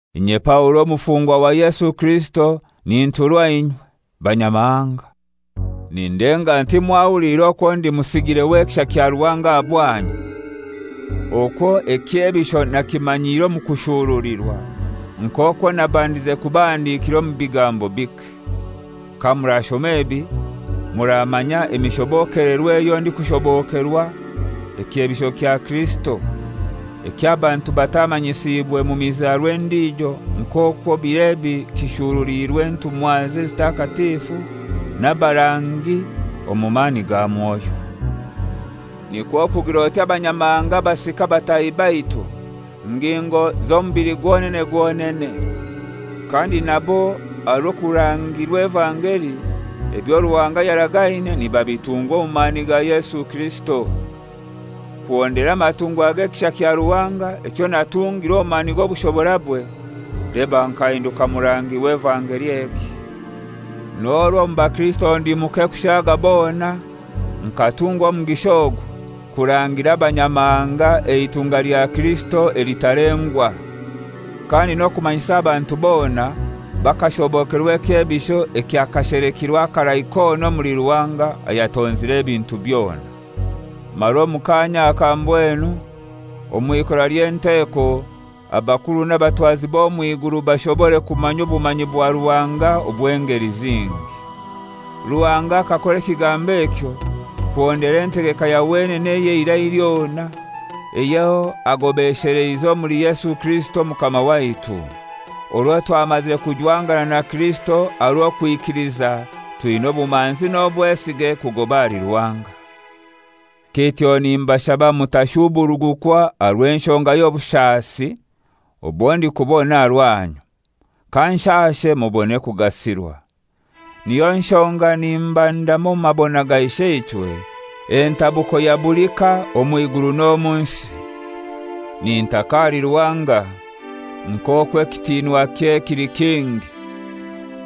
Inye Paulo omufungwa wa Yesu Kirisito ninturwa inywe, Banyamahanga; Nindenga nti mwahuliire okwo ndi musigire w'ekisha kya Ruhanga aha bwanyu, okwo ekyebisho nakimanyiire omu kushurulirwa, nk'okwo nabandize kubahandikira omu bigambo bike. Kamurashoma ebi muramanya emishobokelerwe eyo ndikushobokerwa ekyebisho kya Kirisito eky'abantu batamanyisiibwe mu mizarwa endijo nk'okwo bir'ebi kishuruliirwe entumwaze ezitakatifu n'abarangi omu mani ga Mwoyo. Nikwo kugir'oti Abanyamahanga basika batahi baitu, ngingo z'omubili gwonene gwonene, kandi nabo aha rw'okurangirwa evangeli, ebyo Ruhanga yaragaine nibabitungwa omu mani ga Yesu Kirisito. Kuhondera amatungwa g'ekisha kya Ruhanga ekyo natungirwe omu mani g'obushoborabwe, leba nkahinduka murangi w'evangeli egi. N'orwo omu bakirisito ndi muke kushaaga bona, nkatungwa omugisha ogu: Kurangira Abanyamahanga eitunga lya Kirisito elitalengwa. Kandi n'okumanyisa abantu bona, bakashobokerwa ekyebisho ekyakashelekirwe akarai kona omuli Ruhanga ayatonzire ebintu byona. Mara omu kaanya aka mbwenu, omw'ikora ly'enteko, abakuru n'abatwazi b'omw'iguru bashobore kumanya obumanyi bwa Ruhanga obw'engeli zingi. Ruhanga akakora ekigambo ekyo kuhondera entegeka ya wenene ey'eirai lyona eyo agobesheleize omuli Yesu Kirisito Omukama waitu. Orwo twamazire kujwangana na Kirisito aha rw'owikiliza twina obumanzi n'obwesige kugoba ahali Ruhanga. Kityo nimbashaba mutashuburugukwa aha rw'enshonga y'obushasi obwo ndikubona aha rwanyu; kanshashe mubone kugasirwa. Niyo nshonga nimbandama omu mabona ga Isheichwe, entabuko ya buli ka omw'iguru n'omu nsi. Nintaka ahali Ruhanga, nk'okwo ekitinwakye kili kingi,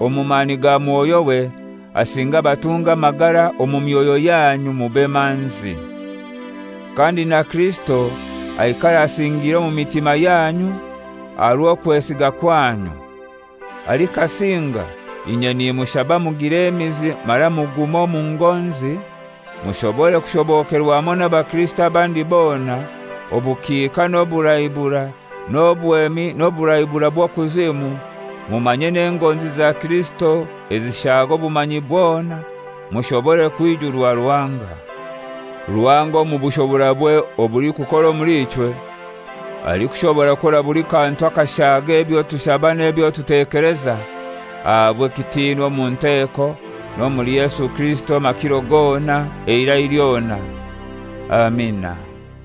omu mani ga Mwoyo we asinge abatunge amagara omu myoyo yanyu mube manzi. Kandi na Kirisito aikare asingiire omu mitima yanyu aha rw'okwesiga kwanyu. Alikasinga inye nimushaba mugire emizi mara mugume omu ngonzi mushobore kushobokerwa hamoi n'abakirisito abandi bona obukiika n'oburaiburai, n'obwemi n'oburaiburai bw'okuzimu, mumanye n'engonzi za Kirisito ezishaaga obumanyi bwona, mushobore kwijurwa Ruhanga. Ruhanga omu bushoborabwe obulikukora omuli ichwe, alikushobora kukora buli kantu akashaaga ebyo tushaba n'ebyo tutekeleza, ahabwe ekitinwa omu nteeko n'omuli Yesu Kirisito amakiro gona, eirai lyona. Amina.